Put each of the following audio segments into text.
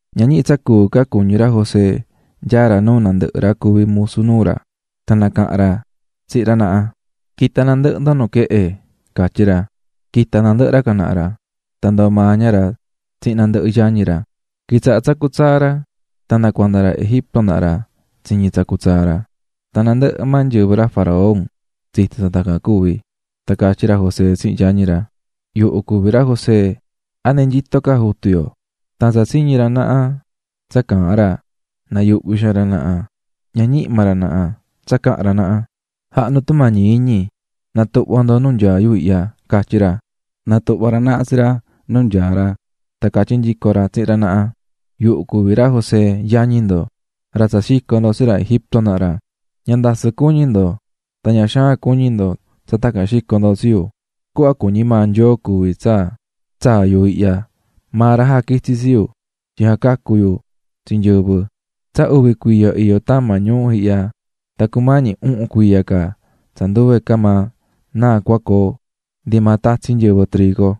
Ña ñihi tsa cuu ca cuñí ra José nyaá ra nuu nandɨhɨ ra cuví musu nuu ra, tan nacaha̱n ra tsihin ra naha: "¡Qui̱ta nandɨhɨ ndo nuquehe!", catyí ra. Quita̱ nandɨhɨ ra can naha ra, tan ndoo̱ maa ña ra tsihin nandɨhɨ yañi ra. Quitsaha̱ tsacú tsaa ra, tan nda cuanda ra Egipto naha ra tsiñi̱ tsacú tsaa ra, tan nandɨhɨ maa nyɨvɨ ra faraón tsito̱ tsa tacan cuvi̱. Tan catyí ra José tsihin yañi ra: --Yuhu cuví ra José. ¿A ndi nyito ca jutu yo? Tan tsa tsiñi̱ ra naha tsa caahán ra nayuhvi̱ xaan ra naha, ña ñihi maa ra naha tsa cahan ra naha. --Ja̱ha ndo tumañi iñi na̱tuhva ndo nu nyaá yu ihya --catyi ra. Natuhva̱ ra naha nu nyaá ra tan catyí nyico ra tsihin ra naha: --Yuhu cuví ra José, yañi ndo, ra tsa xico̱ ndo tsi ra Egipto naha ra. Ña ndasɨ cuñi ndo tan ña xaan cuñi ndo tsa tacan xico̱ ndo tsi yu, cuhva cuñí maa Nyoo cuví tsa tsaa̱ yu ihya, maa ra jaquitsi̱ tsi yu tyin jacacu yu tsi nyɨvɨ. Tsa uvi cuiya iyó tama ñuu ihya tan cumañi uhun cuiya ca tsa nduve maa náa cua coo ndi maa tatsi nyɨvɨ trigo.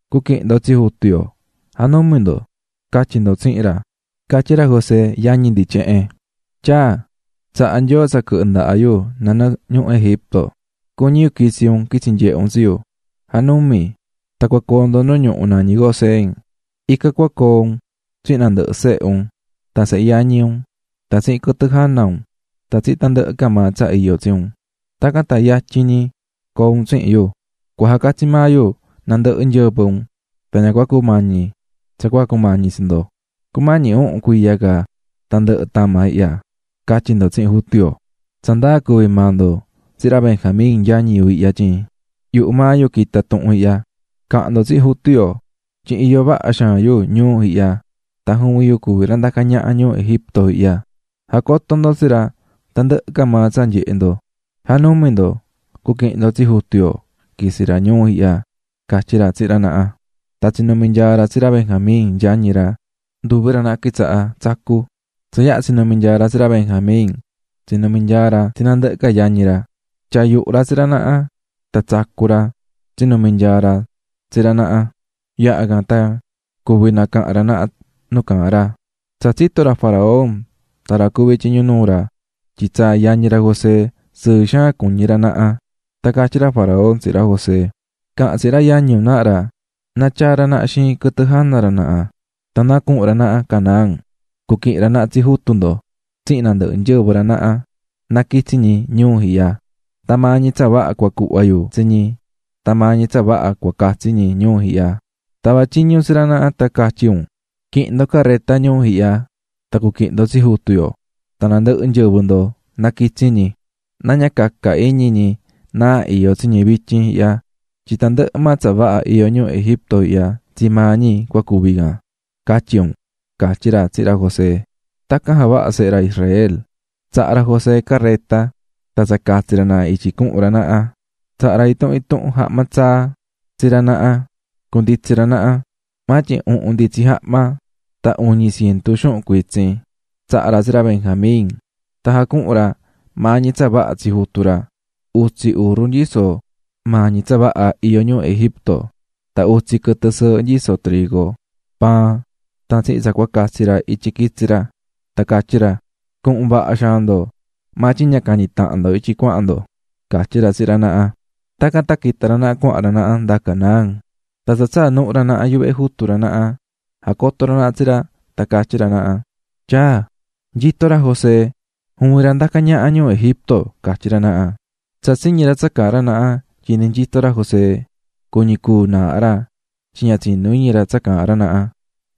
Cu̱aquihin ndo tsi jutu yo, ja̱numi ndo, ca̱tyi ndo tsihin ra, catyí ra José yañi ndi tyehen: ꞌTyaa, tsaha̱ Nyoo tsa quɨhɨ ndaha yu nanɨɨ ñuhu Egipto, cuñí yu quitsi un quitsi nyehe un tsi yu, ja̱numi. Tan cua coo ndo nu ñuhu nañí Gosén, ican cua coo un tsihin nandɨhɨ sehe un, tan sehe yañi un tan tsihin quɨtɨ jana un, tan tsihin tandɨhɨ ca maa tsa iyó tsi un, tacan tan yatyin ñi coo un tsihin yu. Cua jacatsi maa yu tsi nandɨhɨ nyɨvɨ un, tan ña cua cumañi tsa cua cumañi tsi ndo. Cumañí uhun cuiya ca tan ndɨhɨ tama ihyaꞌ, ca̱tyi ndo tsihin jutu yo. Tsa ndaa cuví maa ndo tsihin ra Benjamín yañi yu ihya tyin yuhu maa yu quita̱ tuhun ihya. Ca̱han ndo tsihin jutu yo tyin iyó vaha xaan yu ñuu ihya tan juvin yu cuví ra ndacá ñaha ñuu Egipto ihya, ja̱coto ndos tsi ra tandɨhɨ ca maa tsa nyehe̱ ndo. ¡Ja̱numi ndo, cuaquihin ndo tsi jutu yo quitsi ra ñuu ihya! --catyí ra tsihin ra naha. Tan tsinumi̱ nyaa ra tsi ra Benjamín, yañi ra, nduvi ra naha quitsaha̱ tsacú. Tsa yaha tsinumi̱ nyaa ra tsi ra Benjamín, tsinumi̱ nyaa ra tsi nandɨhɨ ca ra yañi ra, tyaa̱ yuhu ra tsi ra naha, tan tsacú ra tsinumi̱ nyaa ra tsi ra naha. Yaha can tan cuvi̱ nacaha̱n ra naha nu caahán ra. Tsa tsito̱ ra faraón tan ra cuví tyiñu nuu ra tyin tsaa̱ yañi ra José, sɨɨ xaan cuñí ra naha. Tan catyí ra faraón tsihin ra José: --Ca̱han tsihin ra yañi un naha ra na tyaa ra naha xiin quɨtɨ jana ra naha tan na cuhun ra naha Canaán, cuquihin ra naha tsi jutu ndo tsihin nandɨhɨ nyɨvɨ ra naha na quitsi ñi ñuu ihya. Tan maa ñi tsa vaha cua cuhva yu tsi ñi tan maa ñi tsa vaha cua catsi ñi ñuu ihya. Ta̱va tyiñu tsi ra naha tan catyi un: ꞌQui̱hin ndo careta ñuu ihya tan cu̱quihin ndo tsi jutu yo tan nandɨhɨ nyɨvɨ ndo na quitsi ñi. Na ña caca iñi ñi náa iyó tsi ñi vityin ihya tyin tandɨhɨ maa tsa vaha iyó ñuu Egipto ihya tsii maa ñi cua cuvi canꞌ, ca̱tyi un --catyí ra tsihin ra José. Tacan javaha̱ sehe ra Israel, tsaha̱ ra José careta tan tsa catsi ra naha ra ityi cuhun ra naha. Tsaha̱ ra intuhun intuhun jahma tsaa tsi ra naha cunditsi ra naha, maa tyin uhun nditsi jahma tan uñi cientu xuhun cuitsin tsaha̱ ra tsi ra Benjamín. Tan jacuhu̱n ra maa ñi tsa vaha tsi jutu ra: utsi urru nyisó maa ñi tsa vaha iyó ñuu Egipto, tan utsi quɨtɨ sɨɨhɨ nyisó trigo, paan tan tsihin tsa cua catsi ra ityi quitsi ra. Tan catyí ra: --Cuhun vaha xaan ndo, maa tyin ña cañi tahan ndo ityi cuahan ndo --catyí ra tsihin ra naha. Tacan tan quita̱ ra naha cuahan ra naha nda Canaán, tan tsa tsaa̱ nuhu ra naha yuvehe jutu ra naha, jacoto̱ ra naha tsi ra tan catyí ra naha: --Tyaa, nyito ra José, juvin ra ndacá ñaha ñuu Egipto ―catyí ra naha. Tsa tsiñi̱ ra tsa caahán ra naha tyin ndi nyito ra José, cuñi̱ cúu naaha ra tyin ña tsinú iñi ra tsa caahán ra naha.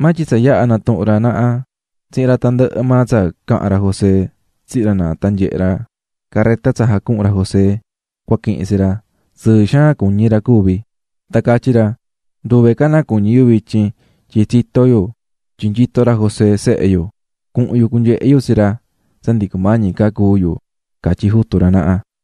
Maa tyin tsa yaha natuhu̱n ra naha tsihin ra tandɨhɨ maa tsa caha̱n ra José tsihin ra naha tan nyehe̱ ra careta tsa jacuhu̱n ra José cua quihin tsi ra, sɨɨ xaan cuñí ra cuvi̱. Tan catyí ra: "¡Nduve ca náa cuñí yu vityin tyin tsito̱ yu tyin nyito ra José, sehe yu! Cuhun yu cunyehe yu tsi ra tsa ndi cumañi ca cúu yu", catyí jutu ra naha.